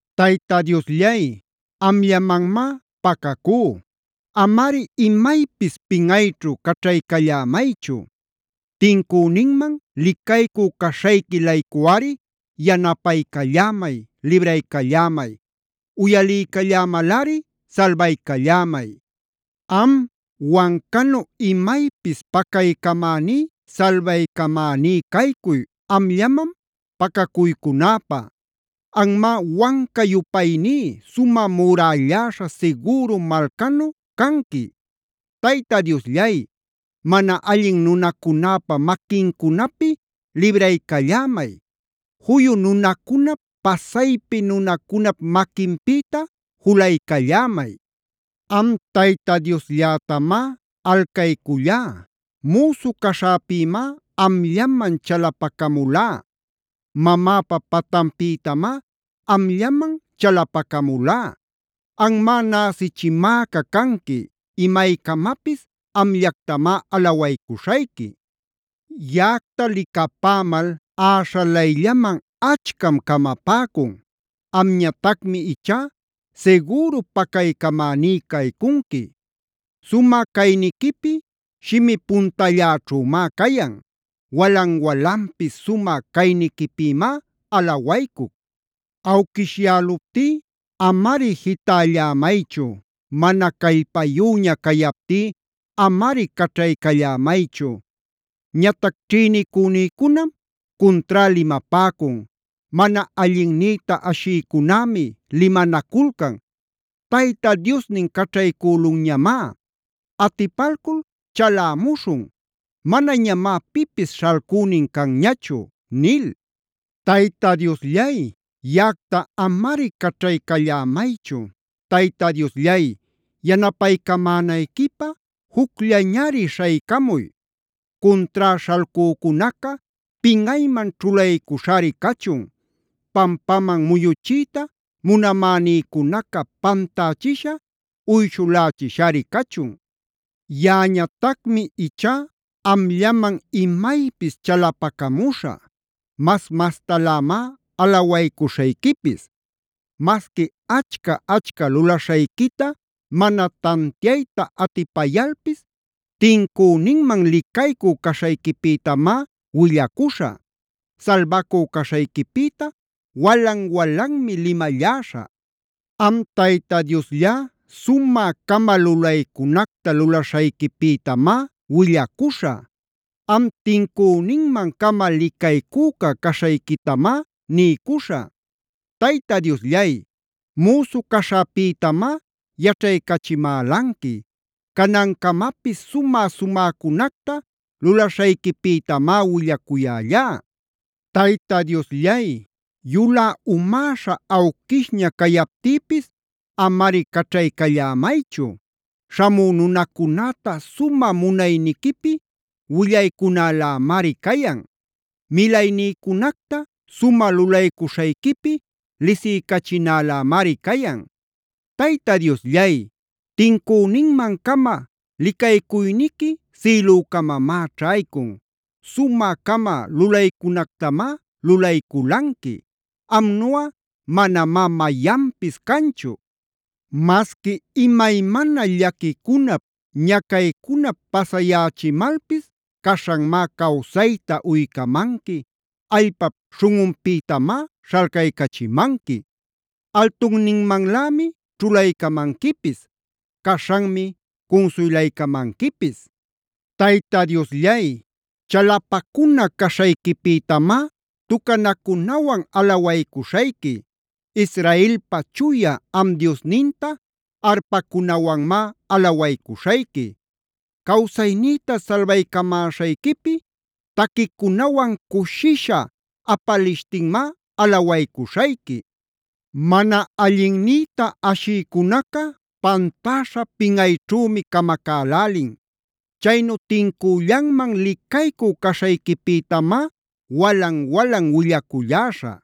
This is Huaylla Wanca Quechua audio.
Tayta Diosllay, amllamanmá pacacú; amari imaypis pinꞌayćhu caćhaycallämaychu. Tincüninman licaycü caśhayqui-laycuꞌari yanapaycallämay, libraycallämay. Uyaliycallämalꞌari salbaycallämay. Am, wancanu imaypis pacaycamäní, salbaycamäní caycuy amllaman pacacuycunäpä. Anmá wanca-yupayní, sumä murälläśha sigüru malcanu canqui. Tayta Diosllay, mana allin nunacunäpa maquincunapi libraycallämay. Juyu nunacunap, pasaypi nunacunap maquinpïta julaycallämay. Am Tayta Diosllätamá alcaycullá. Müsu caśhäpïmá amllaman chalapacamulá. Mamäpa patanpïtamá amllaman chalapacamulá. Anmá näsichimäca canqui. Imaycamapis amllactamá alawaycuśhayqui. Yaꞌacta licapämal äśhalayllaman achcam camapäcun. Amñatacmi ichá sigüru pacaycamäní caycunqui. Sumä cayniquipi shimi puntalläćhümá cayan. Walan-walanpis sumä cayniquipïmá alawaycuc. Awquishyäluptí amari jitällämaychu. Mana callpayüña cayaptí amari caćhaycallämaychu. Ñatac ćhïnicünïcunam cuntrá limapäcun. Mana allinnïta ashïcunämi limanaculcan: “Tayta Diosnin caćhaycülunñamá. Atipalcul chalämuśhun; manañamá pipis śhalcünin canñachu” nil. Tayta Diosllay, yaꞌacta amari caćhaycallämaychu. Tayta Diosllay, yanapaycamänayquipä jucllañari śhaycamuy. Cuntrá śhalcücunaca pinꞌayman ćhulaycuśhari cachun. Pampaman muyuchiyta munämänïcunaca pantächisha, uyshulächiśhari cachun. Yaꞌañatacmi ichá amllaman imaypis chalapacamuśhä. Mas-mastalämá alawaycuśhayquipis. Masqui achca-achca lulaśhayquita mana tantiayta atipayalpis tincüninman licaycü caśhayquipïtamá willacuśhä. Salbacu caśhayquipïta walan-walanmi limalläśhä. Am Tayta Diosllá sumä-cama lulaycunacta lulaśhayquipïtamá willacuśhä. Am tincüninman-cama licaycüca caśhayquitamá niycuśhä. Tayta Diosllay, müsu caśhäpïtamá yaćhaycachimälanqui. Canancamapis sumä-sumäcunacta lulaśhayquipïtamá willacuyällá. Tayta Diosllay, yulä umäśha awquishña cayaptïpis amari caćhaycallämaychu. Śhamü nunacunäta sumä munayniquipi willaycunälämari cayan. Milaynïcunacta sumä lulaycuśhayquipi lisiycachinälämari cayan. Tayta Diosllay, tincüninman-cama licaycuyniqui sïlücamamá ćhaycun. Sumä-cama lulaycunactamá lulayculanqui. ¡Amnuꞌa manamá mayanpis canchu! Masqui imaymana llaquicunap, ñacaycunap pasayächimalpis caśhanmá cawsayta uycamanqui, allpap śhunꞌunpïtamá śhalcaycachimanqui. Altunninmanlämi ćhulaycamanquipis. Caśhanmi cunsuylaycamanquipis. Tayta Diosllay, chalapacuna caśhayquipïtamá tucanacunawan alawaycuśhayqui. Israelpa Chuya am Diosninta arpacunawanmá alawaycuśhayqui. Cawsaynïta salbaycamäśhayquipi taquicunawan cushisha apalishtinmá alawaycuśhayqui. Mana allinnïta ashïcunaca pantäśha, pinꞌayćhümi camacälälin. Chaynu tincüllanman licaycü caśhayquipïtamá walan-walan willaculläśhä.